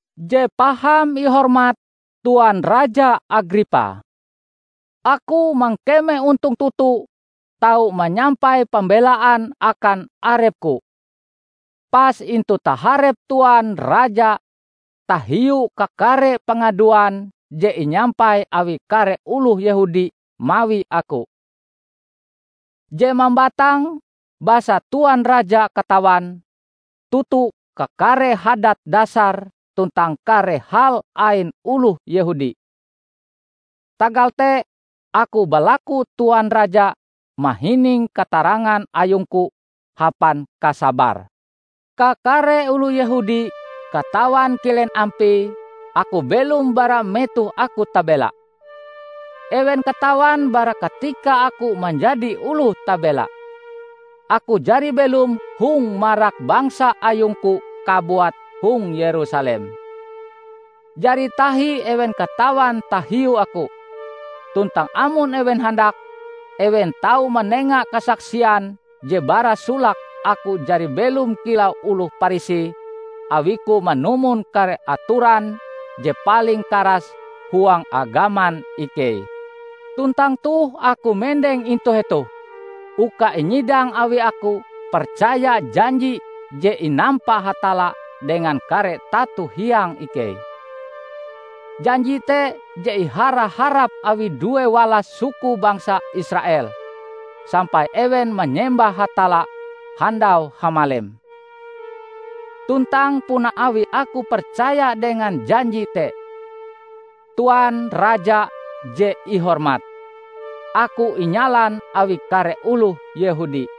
"Je Paham Ihormat Tuan Raja Agripa! Aku mangkeme ontong toto tau manyampai pambelaan akan arepku, pas intu taharep Tuan Raja tahiu kakare pangaduan je inyampai awi kare oloh Yehudi mawi aku; Je mambatang basa Tuan Raja katawan toto kakare hadat dasar tuntang kare hal ain oloh Yehudi. Tagal te aku balaku Tuan Raja mahining katarangan ayungku hapan kasabar. Kakare oloh Yehudi katawan kilen ampie aku belom bara metoh aku tabela. Ewen katawan bara katika aku manjadi oloh tabela, aku jari belom hong marak bangsa ayungku kabuat hong Yerusalem. Jari tahi ewen katawan tahiu aku. Tuntang amon ewen handak, ewen tau manenga kasaksian je bara solake aku jari belom kilau oloh Parisi awiku manumon kare atoran je paling karas huang agaman ikei. Tuntang toh aku mendeng intu hetoh uka inyidang awi aku percaya janji je inampa Hatalla dengan kare tato hiang ikei. Janji te je ihara-harap awi due walas suku bangsa Israel, sampai ewen manyembah Hatalla handau hamalem. Tuntang puna awi aku percaya dengan janji te, Tuan raja je ihormat, aku inyalan awi kare oloh Yehudi.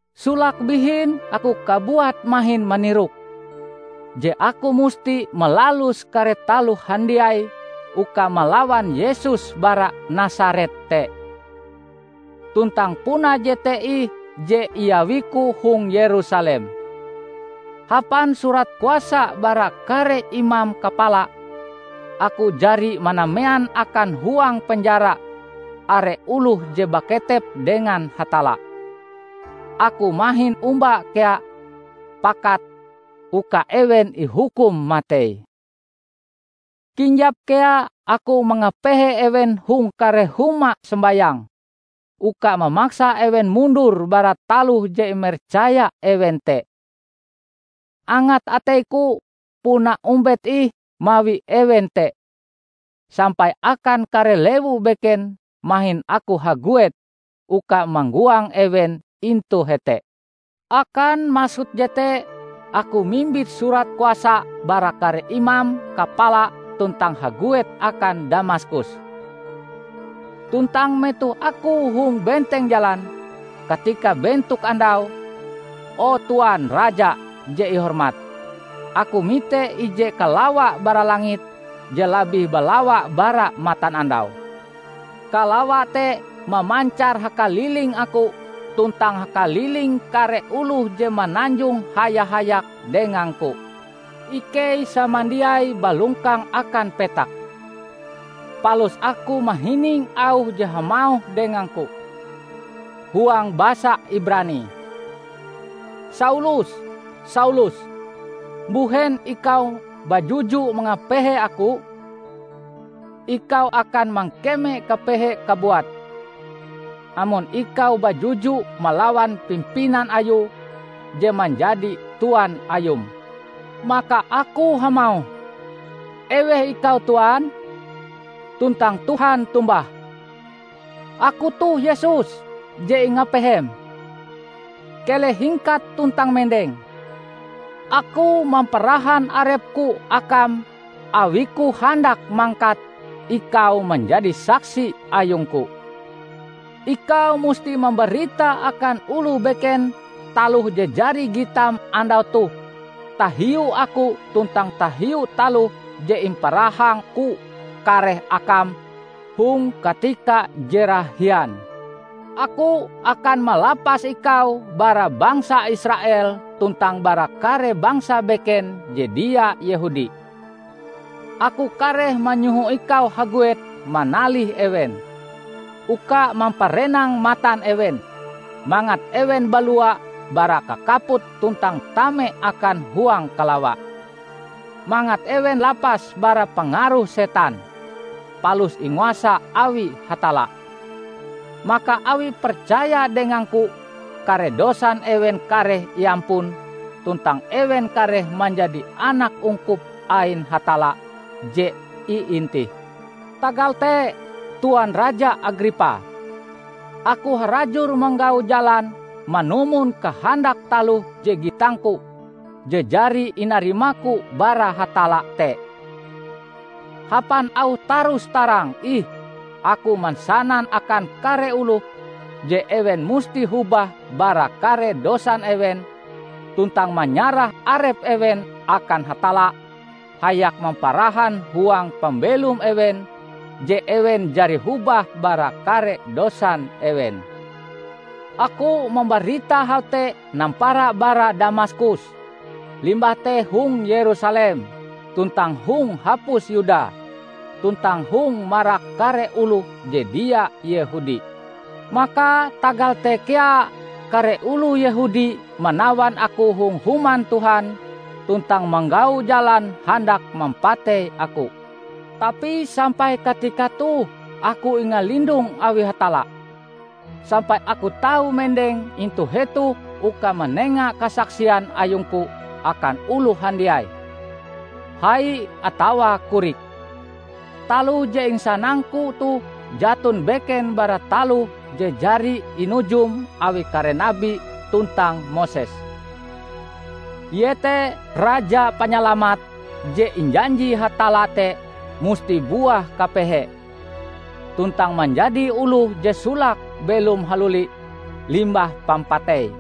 Solake bihin aku kabuat mahin manirok, je aku musti malalus kare taloh handiai uka malawan Yesus bara Nasaret te. Tuntang puna jete ih je iawiku hong Yerusalem. Hapan surat kuasa bara kare imam kapala, aku jari manamean akan huang penjara are oloh je baketep dengan Hatalla. Aku mahin omba kea pakat uka ewen ihukum matei. Kinjap kea aku mangapehe ewen hong kare huma sombayang, uka mamaksa ewen mundur bara taloh je imercaya ewen te. Angat ateiku puna ombet ih mawi ewen te, sampai akan kare lewu beken mahin aku haguet uka manggoang ewen intu hete." "Akan maksud jete aku mimbit surat kuasa bara kare imam kapala tuntang haguet akan Damaskus. Tuntang metoh aku hong benteng jalan, katika bentok andau, o Tuan Raja Je Ihormat, aku mite ije kalawa bara langit je labih balawa bara matanandau. Kalawa te mamancar hakaliling aku tuntang hakaliling kare oloh je mananjong haya-hayak dengangku. Ikei samandiai balongkang akan petak. Palus aku mahining auh je hamauh dengangku huang basa Ibrani, 'Saulus, Saulus! Mbuhen ikau bajuju mangapehe aku? Ikau akan mangkeme kapehe kabuat, amon ikau bajuju malawan pimpinan Ayue je manjadi Tuan ayum.' Maka aku hamauh, 'Eweh ikau Tuan?' tuntang Tuhan tombah, 'Aku toh Yesus je ingapehem. Keleh hingkat tuntang mendeng! Aku mamparahan arep-Ku akam awi-Ku handak mangkat ikau manjadi saksi ayung-Ku. Ikau musti mambarita akan oloh beken taloh je jari gitam andau toh tahiu Aku tuntang tahiu taloh je imparahang-Ku kareh akam hong katika je rahian. Aku akan malapas ikau bara bangsa Israel tuntang bara kare bangsa beken je dia Yehudi. Aku kareh manyoho ikau haguet manalih ewen, uka mamparenang matan ewen, mangat ewen balua bara kakaput tuntang tame akan huang kalawa; mangat ewen lapas bara pangaruh Setan, palus inguasa awi Hatalla. Maka awi percaya dengang-Ku kare dosan ewen kareh iampun tuntang ewen kareh manjadi anak ungkup ain Hatalla je iintih.' " "Tagal te Tuan Raja Agripa, aku harajur manggau jalan manumon kahandak taloh je gitangku je jari inarimaku bara Hatalla te. Hapan auh tarus-tarang ih aku mansanan akan kare oloh je ewen musti hobah bara kare dosan ewen tuntang manyarah arep ewen akan Hatalla hayak mamparahan huang pambelom ewen je ewen jari hobah bara kare dosan ewen. Aku mambarita hal te nampara bara Damaskus, limbah te hong Yerusalem tuntang hong hapus Yuda tuntang hong marak kare oloh je dia Yehudi. Maka tagal te kea kare oloh Yehudi manawan aku hong Human Tuhan tuntang manggau jalan handak mampatei aku. Tapi sampai katika toh aku ingalindong awi Hatalla, sampai aku tau mendeng intu hetoh uka manenga kasaksian ayungku akan oloh handiai -- hai atawa korik. Taloh je insanangku toh jaton beken bara taloh je jari inujum awi kare nabi tuntang Moses; iete Raja Panyalamat je injanji Hatalla te musti buah kapehe, tuntang manjadi oloh je solake belom haluli limbah pampatei;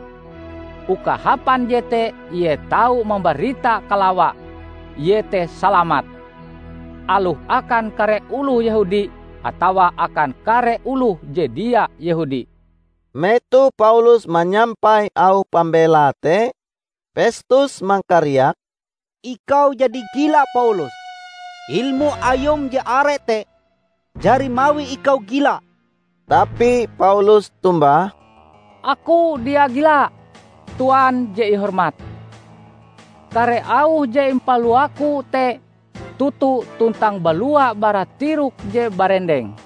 uka hapan jete ie tau mambarita kalawa -- iete salamat -- aloh akan kare oloh Yehudi atawa akan kare oloh je dia Yehudi." Metoh Paulus manyampai auh pambelae te, Pestus mangkariak, "Ikau jadi gila Paulus! Ilmu ayum je are te jari mawi ikau gila!" Tapi Paulus tombah, "Aku dia gila, Tuan je ihormat. Kare auh je impaluaku te toto tuntang balua bara tirok je barendeng.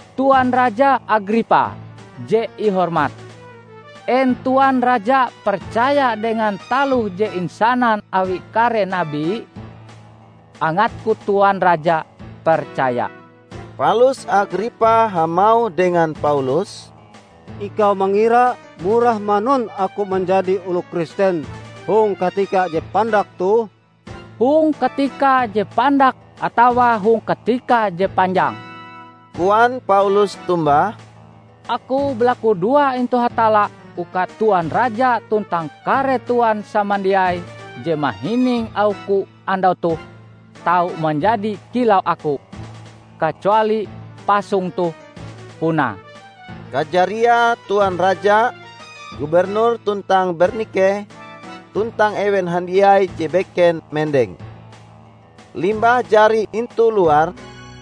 Tuan Raja Agripa Je Ihormat, en Tuan Raja percaya dengan taloh je insanan awi kare nabi? Angatku Tuan Raja percaya!" Palus Agripa hamauh dengan Paulus, "Ikau mangira murah manun aku manjadi oloh Kristen hong katika je pandak toh?" "Hong katika je pandak atawa hong katika je panjang," koan Paulus tombah, "aku balakudoa intu Hatalla uka Tuan Raja tuntang kare Tuan samandiai je mahining auhku andau toh tau manjadi kilau aku -- kacuali pasong toh, punae!" Kajariae Tuan Raja, gubernur tuntang Bernike, tuntang ewen handiai je beken mendeng. Limbah jari intu luar,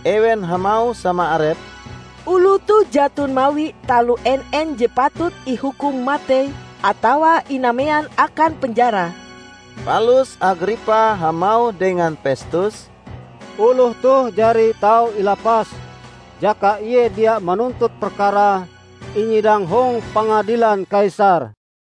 ewen hamauh sama arepe, "Oloh toh jaton mawi taloh en-en je patut ihukum matei atawa inamean akan penjara." Palus Agripa hamauh dengan Pestus, "Oloh toh jari tau ilapas, jaka ie dia manuntut perkarae inyidang hong pangadilan Kaisar."